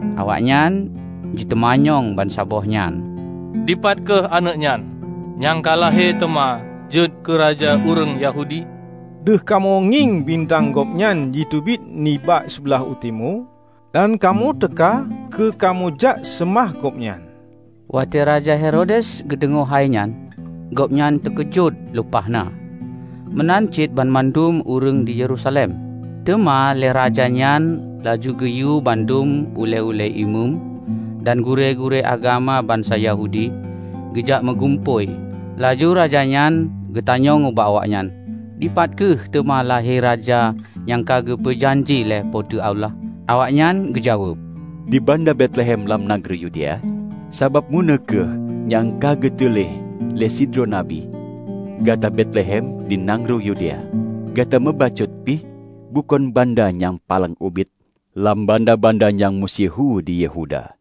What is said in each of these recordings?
Awaknyan jiteumanyong bansaboh nyan, "Dipat kheueh aneuëk nyan, nyang ka lahé teuma jeuet keu raja ureuëng Yahudi? Deuh kamoe ngieng bintang Gobnyan jiteubiet nibak siblaih u timu, dan kamoe teuka keu kamoe jak seumah Gobnyan." Watée Raja Herodes geudeungoe hai nyan, gobnyan teukeujot lumpah na, meunan cit banmandum ureuëng di Yerusalem. Teuma lé raja nyan laju geuyue bandum ulée-ulée imeum dan gurée-gurée agama bansa Yahudi geujak meugumpôi. Laju raja nyan geutanyong ubak awaknyan, "Dipat kheueh teuma lahé Raja nyang ka geupeu janji lé Po teu Allah?" Awaknyan geujaweueb, "Di Banda Betlehem lam nanggroe Yudea. Sabab meunoe kheueh nyang ka geutuléh lé sidroe nabi, 'Gata Betlehem, di nanggroe Yudea, gata meubacut pih bukon banda nyang paleng ubit lam banda-banda nyang meusyeuhu di Yehuda.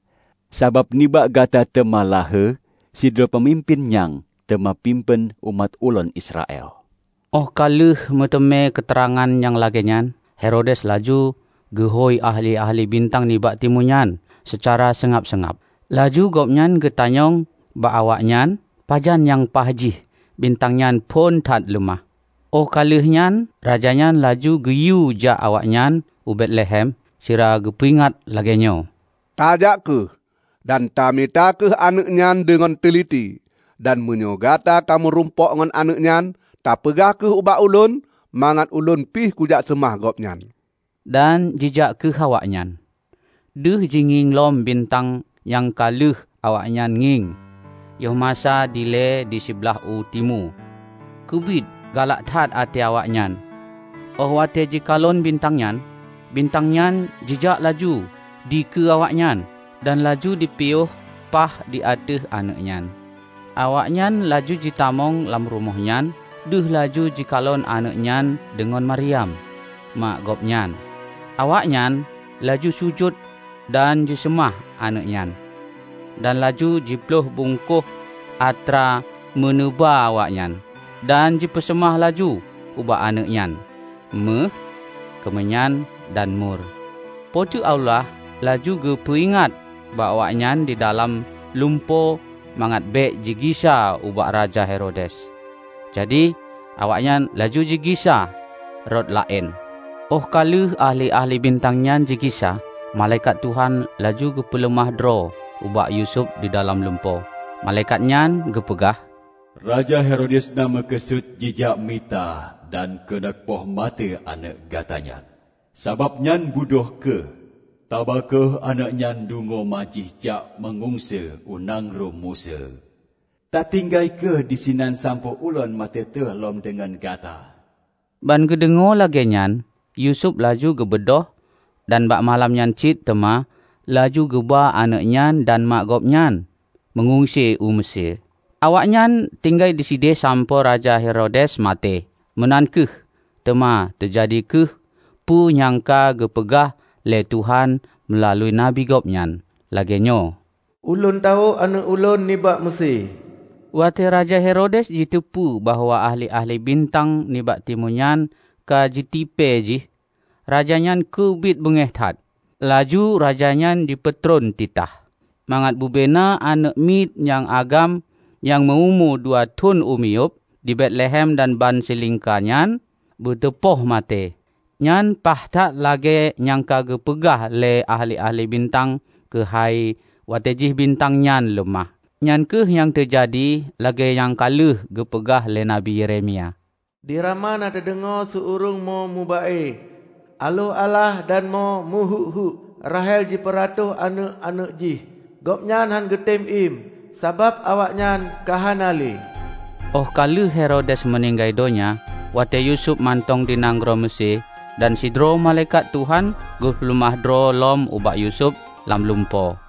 Sabab nibak gata teuma lahé sidroe peumimpén nyang teuma pimpén umat Ulôn Israel.' " Óh ka lheueh meuteumé keuteurangan nyang lagée nyan, Herodes laju geuhôi ahli-ahli bintang nibak timu nyan seucara seungab-seungab. Laju gobnyan geutanyong bak awaknyan pajan nyang paih jih bintang nyan phon that leumah. Óh ka lheueh nyan raja nyan laju geuyue jak awaknyan u Betlehem sira geupeuingat lagée nyoe, "Tajak kheueh, dan tamita kheueh aneuëk nyan deungon teuliti. Dan meunyoe gata ka meurumpok ngon aneuëk nyan, tapeugah kheueh ubak ulôn, mangat ulôn pih kujak seumah Gobnyan." Dan jijak kheueh awaknyan. Deuh jingieng lom bintang nyang ka lheueh awaknyan ngieng yoh masa dilée di siblaih u timu. Keubiet galak that até awaknyan óh watée jikalon bintang nyan! Bintang nyan jijak laju dikeue awaknyan, dan laju jipiyôh paih di ateueh aneuëk nyan. Awaknyan laju jitamong lam rumoh nyan deuh laju jikalon aneuëk nyan deungon Mariam, ma Gobnyan. Awaknyan laju sujut dan jiseumah aneuëk nyan, dan laju jiploih bungkôh atra meuneuba awaknyan, dan jipeuseumah laju ubak aneuëk nyan méuh, keumeunyan, dan mur. Po teu Allah laju geupeu ingat ubak awaknyan didalam lumpo mangat bék jigisa ubak Raja Herodes. Jadi awaknyan laju jigisa rot laén. Óh ka lheueh ahli-ahli bintang nyang jigisa, malaikat Tuhan laju geupeuleumah droe ubak Yusuf didalam lumpo. Malaikat nyan geupeugah, "Raja Herodes na meukeusut jijak mita dan keuneuk poh maté aneuëk gata nyan. Sabab nyan beudôh kheueh, taba kheueh aneuëk nyan deungon ma jih jak meungungse u nanggroe Meusé. Tatinggai kheueh disinan sampoe Ulôn meututoe lom deungon gata." Ban geudeungoe lagée nyan Yusuf laju geubeudôh, dan bak malam nyan cit teuma laju geuba aneuëk nyan dan ma Gobnyan meungungse u Meusé. Awaknyan tinggai disideh sampoe Raja Herodes maté. Meunan kheueh, teuma teujadi kheueh peue nyang ka geupeugah lé Tuhan meulalu nabi Gobnyan, lagée nyoe, "Ulôn tawök Aneuëk Ulôn nibak Meusé." Watée Raja Herodes jiteupeu bahwa ahli-ahli bintang nibak timu nyan ka jitipée jih, raja nyan keubiet beungéh that. Laju raja nyan jipeutron titah mangat bubena aneuëk miet nyang agam nyang meu-umu dua thon u miyueb di Betlehem dan bansilingka nyan beuteupoh maté. Nyan paih that lagée nyang ka geupeugah lé ahli-ahli bintang keuhai watée jih bintang nyan leumah. Nyan kheueh nyang teujadi lagée nyang ka lheueh geupeugah lé Nabi Yeremia, "Di Rama na teudeungoe su ureuëng mo meuba-e, aloh-alah dan mo meuheuék-heuék. Rahel jipeuratoh aneuëk-aneuëk jih; gobnyan hán geutem iem sabab awaknyan ka hana lé." Óh ka lheueh Herodes meuninggai donya, watée Yusuf mantong di nanggroe Meusé dan sidroe malaikat Tuhan geupeuleumah droe lom ubak Yusuf lam lumpo.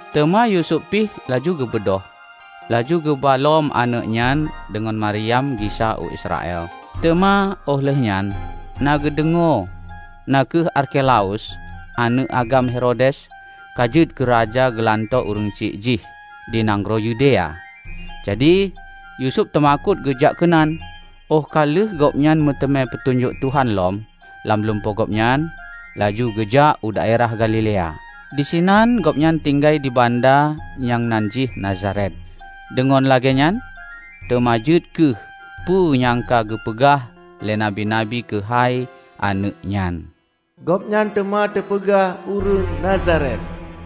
Teuma Yusuf pih laju geubeudôh, laju geuba lom aneuëk nyan deungon Mariam gisa u Israel. Teuma óh lheueh nyan na geudeungoe na kheueh Arkelaus, aneuëk agam Herodes ka jeuet keuraja geulanto ureuëng syiek jih di nanggroe Yudea. Jadi, Yusuf teumakot geujak keunan. Óh ka lheueh gobnyan meuteumé peutunyok Tuhan lom lam lumpo gobnyan, laju geujak u daerah Galilea. Disinan gobnyan tinggai di banda nyang nan jih Nazaret. Deungon lagée nyan teuma jeuet kheueh peue nyang ka geupeugah lé nabi-nabi keuhai aneuëk nyan: "Gobnyan teuma teupeugah Ureuëng Nazaret."